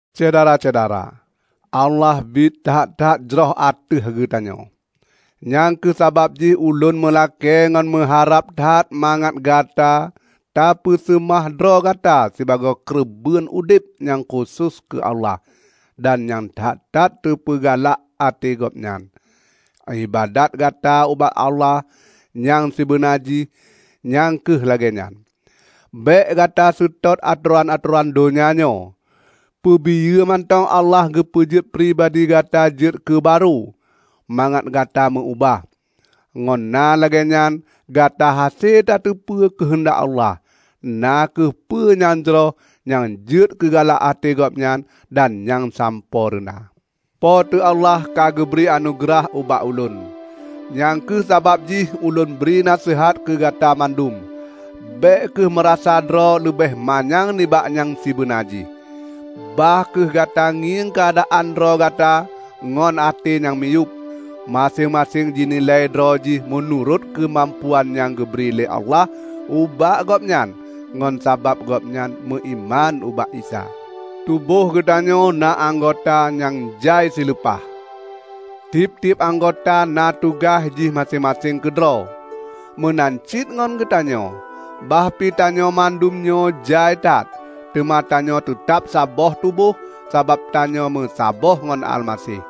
Syedara-syedara! Allah biet that-that jroh ateueh geutanyoe. Nyang kheueh sabab jih ulôn meulakée ngon meuharab that mangat gata tapeuseumah droe gata sibagoe keureubeuen udeb nyang khusos keu Allah dan nyang that-that teupeugalak até Gobnyan. Iébadat gata ubak Allah nyang sibeuna jih nyang kheueh lagée nyan. Bék gata seutôt atoran-atoran donya nyoe. Peubiyeu mantong Allah geupeujeuet pribadi gata jeuet keu barô, mangat gata meu-ubah. Ngon na lagée nyan gata hase tateupeue keuheundak Allah -- na kheueh peue nyang jroh nyang jeuet keu galak até Gobnyan dan nyang sampoereuna. Po teu Allah ka geubri anugeurah ubak ulôn. Nyang kheueh sabab jih ulôn bri naseuhat keu Gata mandum: Bék kheueh meurasa droe leubeh manyang nibak nyang sibeuna jih. Bah kheueh gata ngieng keuadaan droe gata ngon até nyang miyueb; maséng-maséng jinilai droe jih meunurot keumampuan nyang geubri lé Allah ubak gobnyan ngon sabab gobnyan meuiman ubak Isa. Tuboh geutanyoe na anggota nyang jai sileupah. Tieb-tieb anggota na tugaih jih maséng-maséng keudroe. Meunan cit ngon geutanyoe. Bah pi tanyoe mandum nyoe jai that, teuma tanyoe teutab saboh tuboh sabab tanyoe meusaboh ngon Almaseh.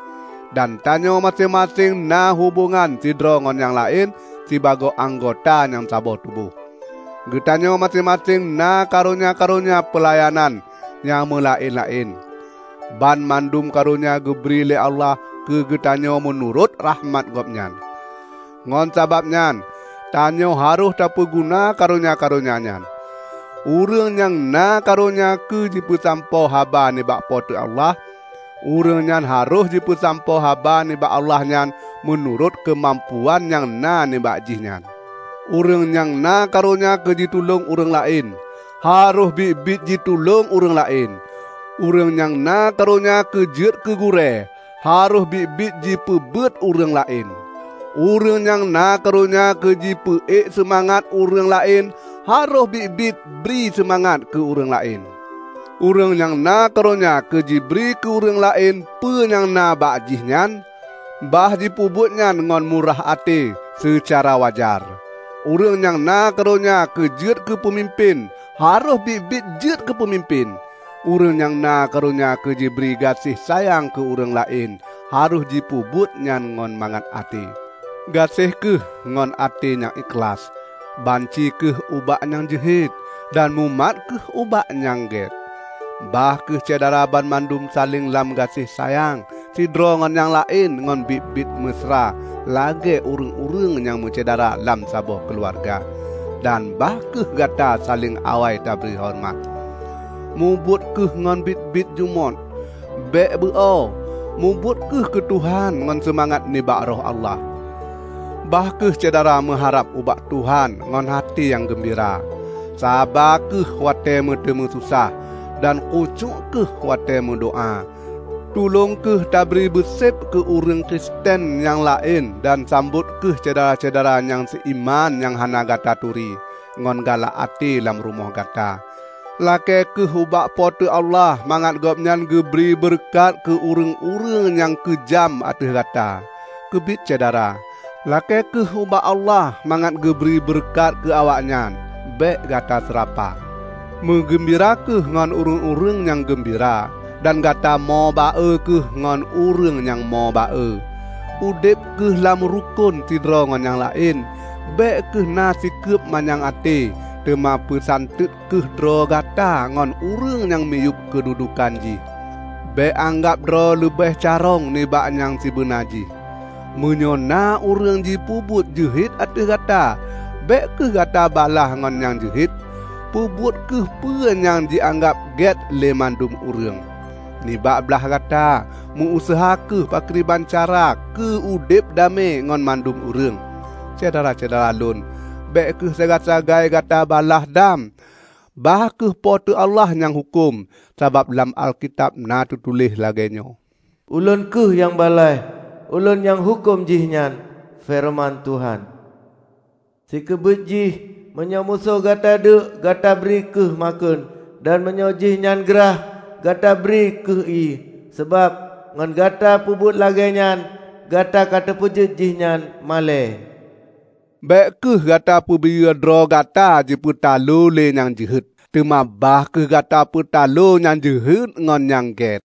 Dan tanyoe maséng-maséng na hubongan sidroe ngon nyang laén sibagoe anggota nyang saboh tuboh. Geutanyoe maséng-maséng na karonya-karonya peulayanan nyang meulaén-laén. Banmandum karonya geubri lé Allah keu geutanyoe meunurot rakhmat Gobnyan. Ngon sabab nyan tanyoe harôh tapeuguna karonya-karonya nyan. Ureuëng nyang na karonya keu jipeusampoe haba nibak Po teu Allah, ureuëng nyan harôh jipeusampoe haba nibak Allah nyan meunurot keumampuan nyang na nibak jih nyan. Ureuëng nyang na karonya keu jitulông ureuëng laén, harôh biet-biet jitulông ureuëng laén. Ureuëng nyang na karonya keu jeuet keu gurée, harôh biet-biet jipeubeuet ureuëng laén. Ureuëng nyang na karonya keu jipeu ék seumangat ureuëng laén, harôh biet-biet jibri seumangat keu ureuëng laén. Ureuëng nyang na karonya keu jibri keu ureuëng laén peue nyang na bak jihnyan, bah jipeubuet nyan ngon murah até seucara wajar. Ureuëng nyang na karonya keu jeuet keupeumimpén, harôh biet-biet jeuet keupeumimpén. Ureuëng nyang na karonya keu jibri gaséh sayang keu ureuëng laén, harôh jipeubuet nyan ngon mangat até. Gaséh kheueh ngon até nyang ikhlaih. Banci kheueh ubak nyang jeuhet, dan mumat kheueh ubak peue nyang gét. Bah kheueh Syedara banmandum saléng lam gaséh sayang sidroe ngon nyang laén ngon biet-biet meusra lagée ureuëng-ureuëng nyang meusyedara lam saboh keuluwarga, dan bah kheueh gata saléng awai tabri horeumat. Mubuet kheueh ngon biet-biet jumôt. Bék beu oe. Mubuet kheueh keu Tuhan ngon seumangat nibak Roh Allah. Bah kheueh Syedara meuharab ubak Tuhan ngon até nyang geumbira, saba kheueh watée meuteumé sosah, dan khusyuék kheueh watée meudoá. Tulông kheueh tabri beuseb keu ureuëng Kristen nyang laén dan sambot kheueh syedara-syedara nyang seuiman nyang hana Gata turi, ngon galak até lam rumoh gata. Lakée kheueh ubak Po teu Allah mangat Gobnyan geubri beureukat keu ureuëng-ureuëng nyang keujam ateueh gata. Keubiet syedara, lakée kheueh ubak Allah mangat geubri beureukat keu awaknyan, bék gata seurapa. Meugeumbira kheueh ngon ureuëng-ureuëng nyang geumbira, dan gata mo ba-e kheueh ngon ureuëng nyang mo ba-e. Udeb kheueh lam rukon sidroe ngon nyang laén. Bék kheueh na sikeub manyang até, teuma peusanteut kheueh droe gata ngon ureuëng nyang miyueb keududuekan jih. Bék anggab droe leubeh carông nibak nyang sibeuna jih. Meunyoe na ureuëng jipeubuet jeuhet ateueh gata, bék kheueh gata balaih ngon nyang jeuhet. Peubuet kheueh peue nyang jianggab gét lé mandum ureuëng. Nibak blaih gata, meu-useuha kheueh pakriban cara keu udeb damé ngon mandum ureuëng. Syedara-syedara lôn! Bék kheueh sagai-sagai gata balaih dam, bah kheueh Po teu Allah nyang huköm. Sabab lam Alkitab na teutuléh lagée nyoe, "Ulôn kheueh nyang balaih. Ulôn nyang huköm jihnyan, feureuman Tuhan." Sikeubiet jih, meunyoe musoh gata deuek, gata bri kheueh makheun; dan meunyoe jih nyan grah, gata bri kheueh ié. Sabab ngon gata peubuet lagée nyan, Gata ka tapeujeuet jihnyan malée. Bék kheueh gata peubiyeu droe gata jipeutaloe lé nyang jeuhet, teuma bah kheueh Gata peutaloe nyang jeuhet ngon nyang get.